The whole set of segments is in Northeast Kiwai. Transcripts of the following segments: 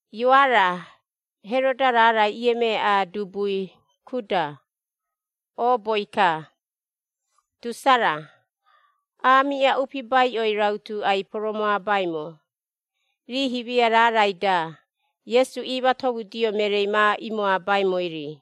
Ioara, Heroda raarai iemeaꞌa dubui Kuda, ooboi-ka, Tusara, aamiꞌa upibaiꞌoi rautu ai-poromoabaimo, rii himia raarai-da, Iesu iimatomudio mereei ma imoabaimoi-ri.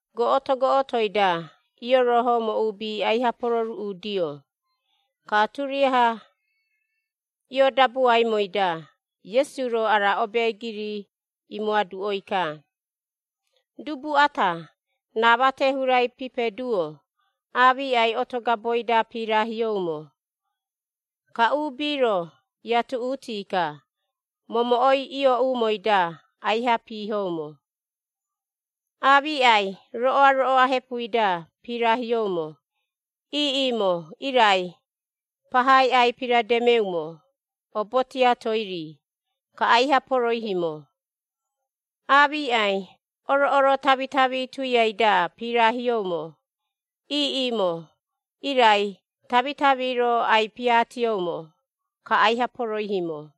Goꞌoto goꞌotoi-da, iorohoumo uubi aiha pororuꞌudio, ka turiaha ioodabuaimoi-da, Iesu-ro ara obeegiri imoaduꞌoi-ka. “Dubu ata, raa mate hurai pipeduo, aamiꞌai oto gaboi-da pirahioumo, ka uubi-ro iatuꞌuti-ka, momoꞌoi iooꞌumoi-da aiha piihoumo. Aamiꞌai roꞌoa-roꞌoa hepui-da pirahioumo, iiꞌimo irai, pahai ai-pirademeumo, obo tiatoi-ri, ka aiha poroihiimo. Aamiꞌai oroꞌoro tamitami tuiai-da pirahioumo, iiꞌimo irai tamitami-ro ai-piaatioumo, ka aiha poroihimo.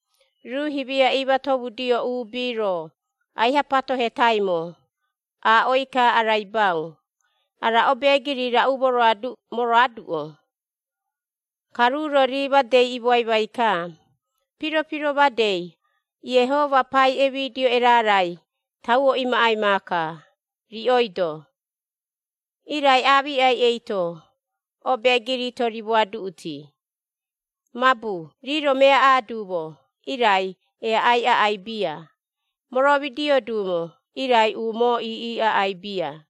Ruu himia iimatomudio uubi-ro aiha patohetaimo, aaꞌoi-ka araibau, “Ara obeegiri raꞌu moroaduꞌo?” Ka ruu-ro rii madei imoaimai-ka, “Piro-piro madei, Iehoma pai emidio erarai, tauo imaꞌai maaka, riꞌoi-do. Irai aamiꞌai eito, obeegiri-to rimoaduꞌuti, mabu rii-ro meaꞌa duumo, irai eaꞌai aꞌai bia, moromidio duumo, irai umoo iiꞌi aꞌai bia.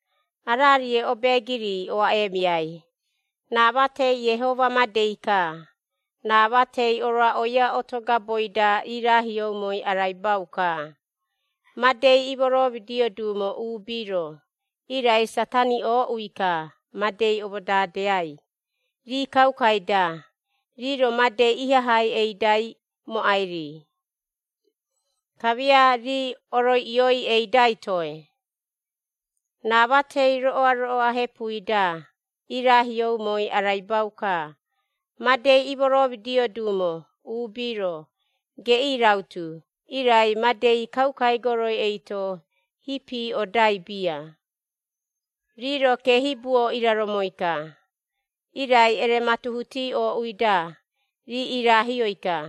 “Ararie obeegiri oaꞌeemiai, raa matei Iehoma madei-ka. Raa matei oroaꞌoia oto gaboi-da irahioumoi, araibau-ka, madei imoromidio duumo uubi-ro, irai Satari ooꞌui-ka madei omodadeai, rii kaukai-da, rii-ro madei ihahai eidai mooꞌai-ri, kamia rii oroiꞌioi eidai toe. Raa matei roꞌoa-roꞌoa hepui-da irahioumoi araibau-ka: madei imoromidio duumo uubi-ro, geꞌii rautu, irai, madei kaukai goroi eito hipi odai bia. Rii-ro keehibuo iraromoi-ka, irai erematuhuti ooꞌui-da, rii irahioi-ka.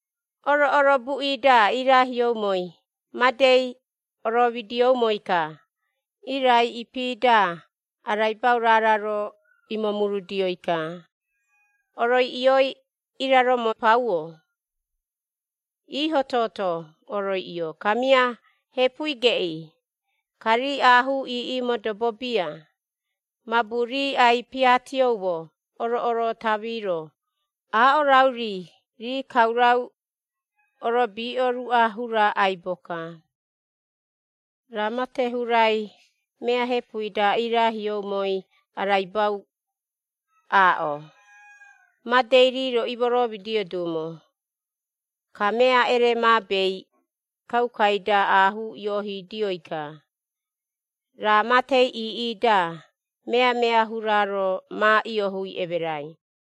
Oroꞌoro buꞌi-da iiraahioumoi, madei oromidioumoi-ka. Irai ipi-da, araibau raara-ro imomurudioi-ka: oroiꞌioi iraromo pauo, iiho-toto oroiꞌio, kamia hepui geꞌii. Ka rii aahuu iiꞌi modobo bia, mabu rii ai-piaatioumo oroꞌoro tami-ro aaꞌo rauri rii kaurau orobiꞌo ruꞌa hura aibo-ka. Raa mate hurai, mea hepui-da irahioumoi, araibau aaꞌo, madei rii-ro imoromidio duumo, ka mea eremaabei kaukai-da, aahuu ioohidioi-ka, raa matei iiꞌi-da, meamea hura-ro ma iohui emerai.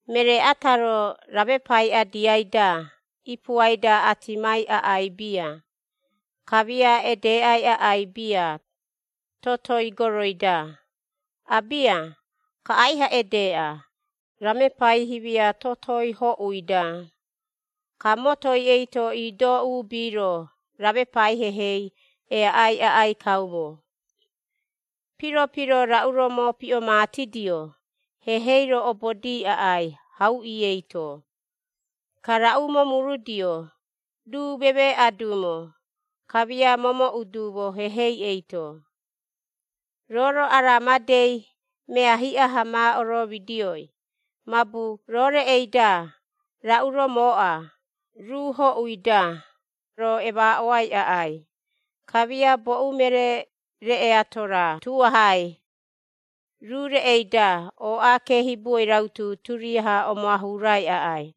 “Meree ata-ro, ramepai adiai-da ipuai-da atimai aꞌai bia, kamia edeꞌai aꞌai bia totoi goroi-da. Abia, ka aiha edeꞌa, ramepai himia totoi hoꞌui-da. Ka motoi eito iido uubi-ro, ramepai hehei eaꞌai aꞌai kaumo. “Piro-piro raꞌu-ro mopiꞌomatidio, hehei-ro obodi aꞌai hauꞌi eito. Ka raꞌu momurudio, ruu memeeꞌa duumo, kamia momooꞌu duumo hehei eito. “Roo-ro ara madei mea hiꞌa-ha ma oromidioi, mabu roo reꞌei-da raꞌu-ro mooꞌa, ruu hoꞌui-da, roo emaaꞌoai aꞌai. Kamia boꞌu meree reꞌe ato-ra tuahai, ruu reꞌei-da ooꞌa keehibuoi rautu turiaha omoahurai aꞌai.”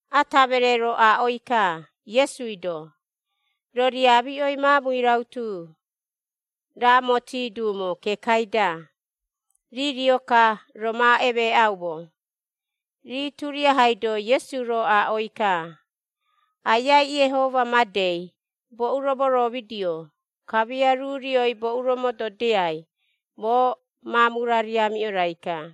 Ata meree-ro aaꞌoi-ka Iesui-do, “Roo riamiꞌoi maamui rautu, raamomoti duumo kekai-da, rii rio-ka, roo ma emeeꞌaumo.” Rii turiahai-do Iesu-ro aaꞌoi-ka, “Aiai Iehoma madei, boꞌu-ro moromidio, kamia, ruu rioi boꞌu-ro mododiai, moo maamu-ra riamiꞌo-raika.”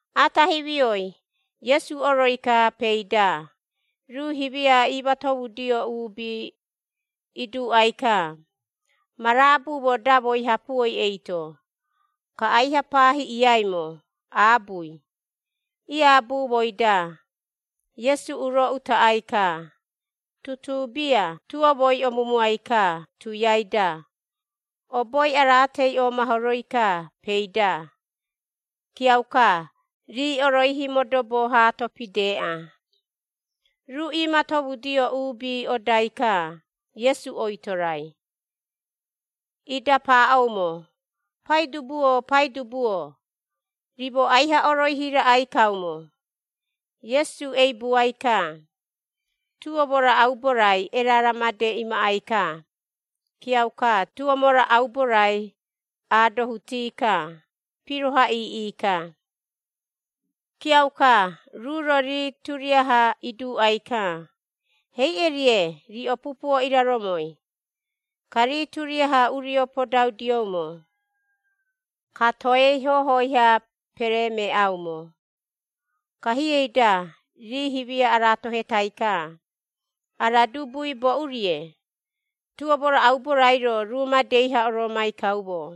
Ata himioi, Iesu oroi-ka peei-da, ruu himia iimatomudio uubi iduuꞌai-ka, “Ma raabumo damoi hapuoi eito.” Ka aiha pahiꞌiaimo aabui. Iaabumoi-da, Iesu uro utaꞌai-ka. Tutuu bia tuomoi omumuai-ka tuiai-da, oboi araatei omahoroi-ka peei-da. Kiauka, rii oroihi modobo haato pideꞌa. Ruu iimatomudio uubi odai-ka Iesu oitorai, ida paaꞌoumo, “Paidubu-o, Paidubu-o! Rimo aiha oroihi raꞌai kaumo!” Iesu eibuai-ka, tuomo-ra aubo-rai erara made imaꞌai-ka, kiauka tuomo-ra aubo-rai aadohuti-ka, piroha iiꞌi-ka. Kiauka ruu-ro rii turiaha iduuꞌai-ka, “Heiꞌe-rie, riꞌo pupuo iraromoi?” Ka rii turiaha urio podaudioumo, ka toei hohoi-ha peremeeꞌaumo, ka hiei-da rii himia aratohei-ka, “Ara dubui boꞌu-rie? Tuomo-ra aubo-rairo, ruu madei-ha oroomai kaumo!”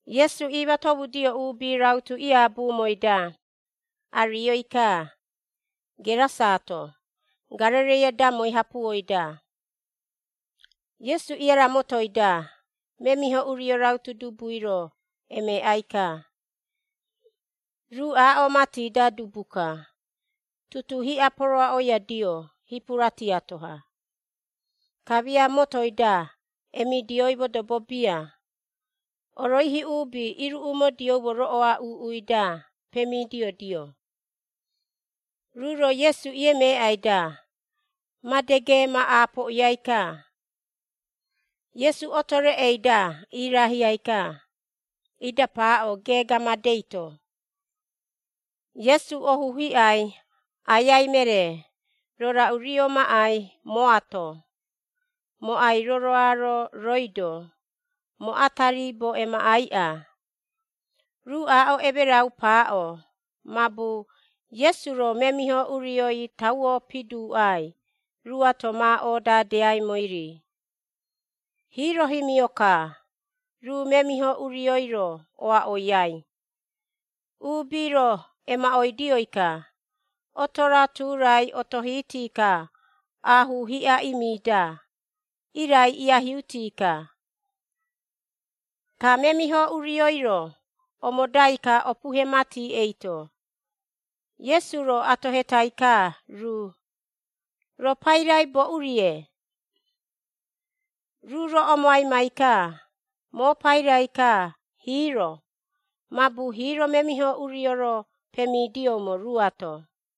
Iesu iimatomudio uubi rautu iaabumoi-da, arioi-ka, Gerasaato, Garereia damoi hapuoi-da. Iesu iaramotoi-da memiho urio rautu dubui-ro emeeꞌai-ka, ruu aaꞌo mati-da dubu-ka. Tutuu hiꞌa poroaꞌoiadio hipura tiato-ha, kamia motoi-da emidioi modobo bia, oroihi uubi iruꞌumodioumo roꞌoa uuꞌui-da pemidiodio. Ruu-ro Iesu iemeeꞌai-da, made geema aapoꞌiai-ka, Iesu otoi reꞌei-da irahiai-ka, ida paaꞌo geega madei-to, “Iesu, ohu hiꞌai Aiai meree! Roo raꞌu rio maꞌai mooato? Moo ai-roroaro rooi-do, moo ata riibo emaꞌaiꞌa!” Ruu aaꞌo emerau paaꞌo, mabu Iesu-ro memiho urioi tauo piduuꞌai ruuato ma odadeaimoi-ri. Hiiro himio-ka, ruu memiho urioi-ro oaꞌoiai, uubi-ro emaꞌoidioi-ka, oto-ra tu-rai otohiti-ka aahuu hiꞌa imi-da. Irai iahiuti-ka, ka memiho urioi-ro omodai-ka opuhe mati eito. Iesu-ro atohetai-ka ruu, “Roo pairai boꞌu-rie?” Ruu-ro omoaimai-ka, “Moo pairai-ka, ‘Hiiro’,” mabu hiiro memiho urio-ro pemidioumo ruuato.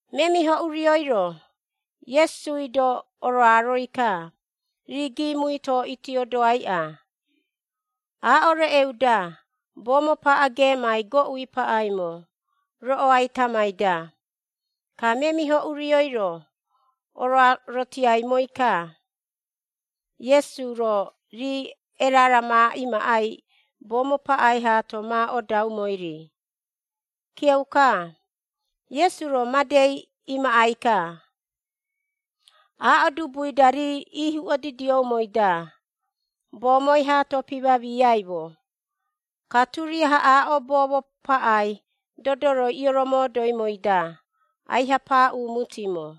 Memiho urioi-ro, Iesui-do oroaroi-ka, rii giimui-to iitiodoaiꞌa. Aaꞌo reꞌeu-da boomo paꞌa geemai goꞌu paꞌaimo, roꞌoai tamai-da. Ka memiho urioi-ro oroarotiaimoi-ka, Iesui-ro, rii erara ma imaꞌai boomo paꞌai haito ma odaumoi-ri, kiauka Iesu-ro madei imaꞌai-ka. Aaꞌo dubui-da, rii ihuꞌodidioumoi-da, boomoi haato pimamiaꞌaiimo, ka turiaha aaꞌo boomo paꞌai, dodoroi iromodoimoi-da, aiha paaꞌumutimo.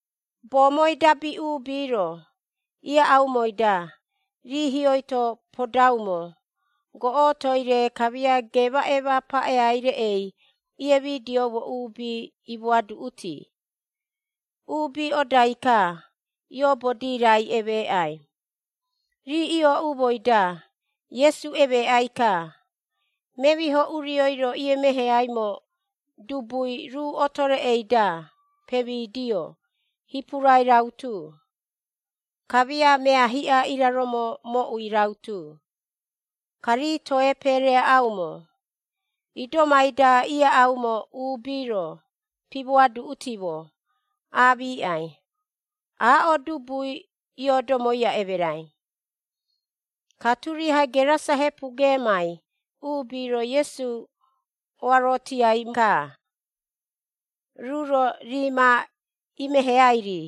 Boomoi dabi uubi-ro ieaꞌaumoi-da, rii hioi-to podaumo goꞌotoi-re kamia geemaꞌeema paꞌeai-rei, iemidioumo uubi imoaduꞌuti. Uubi odai-ka, ioobodi raai emeeꞌai. Rii iooꞌumoi-da Iesu emeeꞌai-ka, memiho urioi-ro iemeheaimo dubui, ruu oto reꞌei-da pemidio hipurai rautu, kamia mea hiꞌa iraromo moꞌui rautu. Ka rii toe peereaꞌaumo. Idomai-da ieaꞌaumo uubi-ro pimoaduꞌutimo, aamiꞌai, aaꞌo dubui ioodomoia emerai. Ka turiaha Gerasa hepu geemai uubi-ro Iesu oarotiai-ka, ruu-ro rii ma imeheai-ri.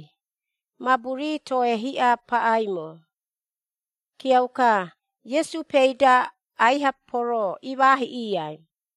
Mabu rii toe hiꞌa paꞌaimo. Kiauka Iesu peei-da aiha poroo imaahiꞌiai.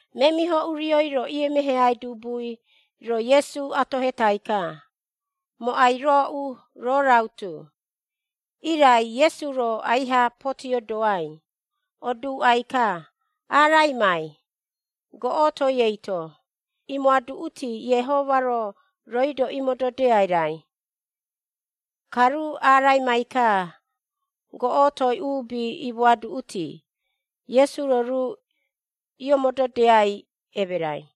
Memiho urioi-ro, iemeheaimo dubui-ro Iesu atohetai-ka, “Moo ai-rooꞌu, roo rautu.” Irai Iesu-ro aiha potiodoai, oduuꞌai-ka, “Araimai, goꞌotoi eito, imoaduꞌuti, Iehoma-ro, rooi-do imododiai raai.” Ka ruu araimai-ka goꞌotoi, uubi imoaduꞌuti, Iesu-ro ruu iomododiai emerai.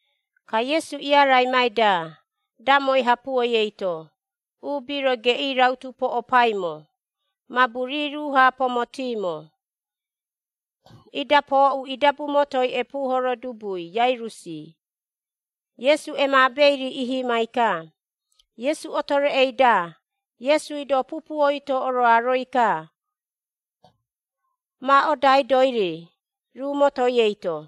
Ka Iesu iaraimai-da damoi hapuoi eito, uubi-ro geꞌii rautu poꞌopaimo, mabu rii ruu-ha pomotiimo. Ida pooꞌu idabu motoi epuuhoro dubui Iairusi, Iesu emaabei-ri ihimai-ka, Iesu oto reꞌei-da, Iesui-do pupuoi-to oroaroi-ka ma odaidoi-ri, ruu motoi eito.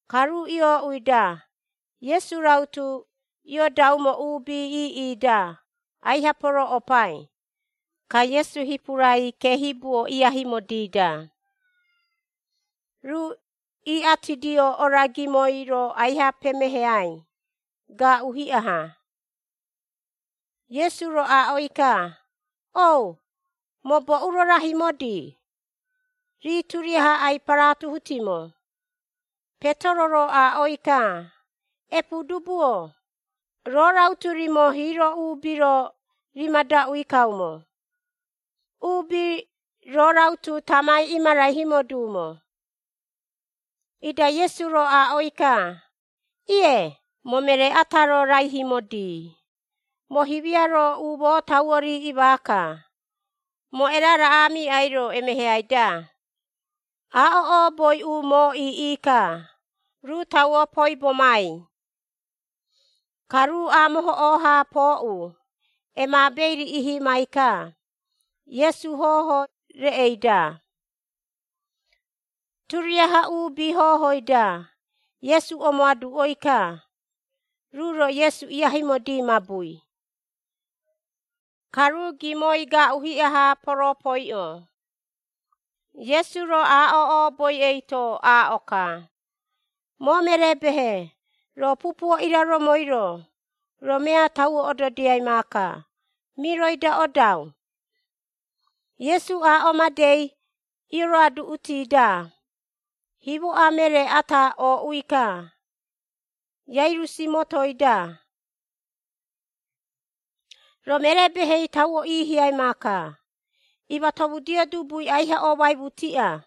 Ka ruu iooꞌui-da, Iesu rautu iodaumo uubi iiꞌi-da, aiha porooꞌopai. Ka Iesu hipurai keehibuo iaihimodi-da, ruu iꞌatidio ora gimoi-ro aiha pemeheai, gaaꞌu hiꞌa-ha. Iesu-ro aaꞌoi-ka, “O, moo boꞌu-ro rahimodi?” Rii turiaha ai-paratuhutimo. Petero-ro aaꞌoi-ka, “Epuudubu-o, roo rautu rimo hiiro uubi-ro rimadaꞌui kaumo, uubi roo rautu tamai imaraihimo duumo.” Ida Iesu-ro aaꞌoi-ka, “Ie, moo meree ata-ro raihimodi, moo himia-ro umoo tauo riiꞌi maaka, moo erarai aamiꞌai-ro, emeheai-da.” Aaꞌo ooboi umoo iiꞌi-ka, ruu tauo poibomai. Ka ruu aamohoꞌoo-ha pooꞌu, emaabei-ri ihimai-ka, Iesu hoho reꞌei-da. Turiaha uubi hohoi-da, Iesu omoaduꞌoi-ka, ruu-ro Iesu iaihimodi mabui, ka ruu gimoi gaaꞌu hiꞌa-ha ioroopoiꞌoi. Iesu-ro aaꞌo ooboi eito aaꞌo-ka, “Moo meree-behe, roo pupuo iraromoi-ro, roo mea tauo ododiai maaka, miroi-da odau.” Iesu aaꞌo madei ioroaduꞌuti-da, himoꞌa meree ata ooꞌui-ka, Iairusi motoi-da, “Roo meree-behei tauo iihiai maaka, imatomudio dubui aiha oomaimutiꞌa.”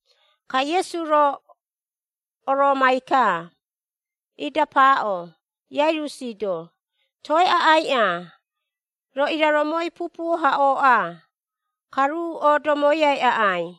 Ka Iesu-ro, oroomai-ka. Ida paaꞌo, Iairusi-do, “Toe aꞌaiꞌa, roo iraromoi pupuo-ha ooꞌa. Ka ruu oodomoiaiꞌai.”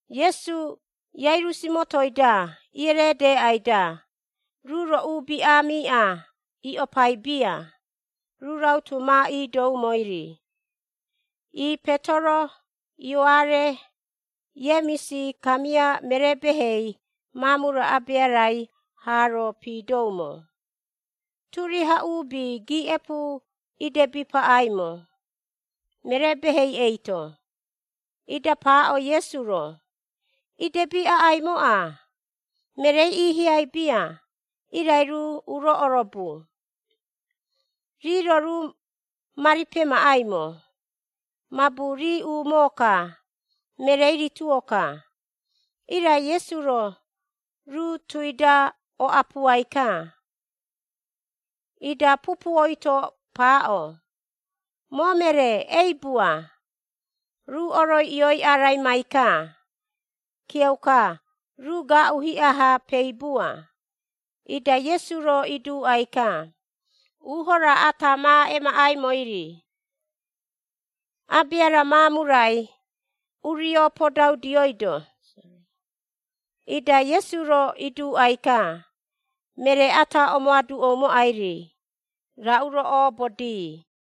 Iesu, Iairusi motoi-da iereedeeꞌai-da, ruu-ro uubi aamiꞌa iꞌopai bia, ruu rautu ma iidoumoi-ri, ii Petero, Ioare, Iemisi, kamia meree-behei maamu-ra abea-rai haa-ro piidoumo. Turiaha uubi giiꞌepu idebi paꞌaimo, meree-behei eito, ida paaꞌo Iesu-ro, “Idebi aꞌaimoꞌa, mereei iihiai bia, irai ruu uro orobu.” Rii-ro ruu mari pemaꞌaimo, mabu rii umoo-ka, mereei rituo-ka. Irai Iesu-ro, ruu tui-da oꞌapuai-ka, ida pupuoi-to paaꞌo, “Moo meree, eibua.” Ruu oroiꞌioi araimai-ka. Kiauka, ruu gaaꞌu hiꞌa-ha peibua, ida Iesu-ro iduuꞌai-ka, uuho raa ata ma emaꞌaimoi-ri. Abea-ra maamu-rai urio podaudioido, ida Iesu-ro iduuꞌai-ka, meree ata omoaduꞌoumoꞌai-ri, raꞌu-ro oobodii.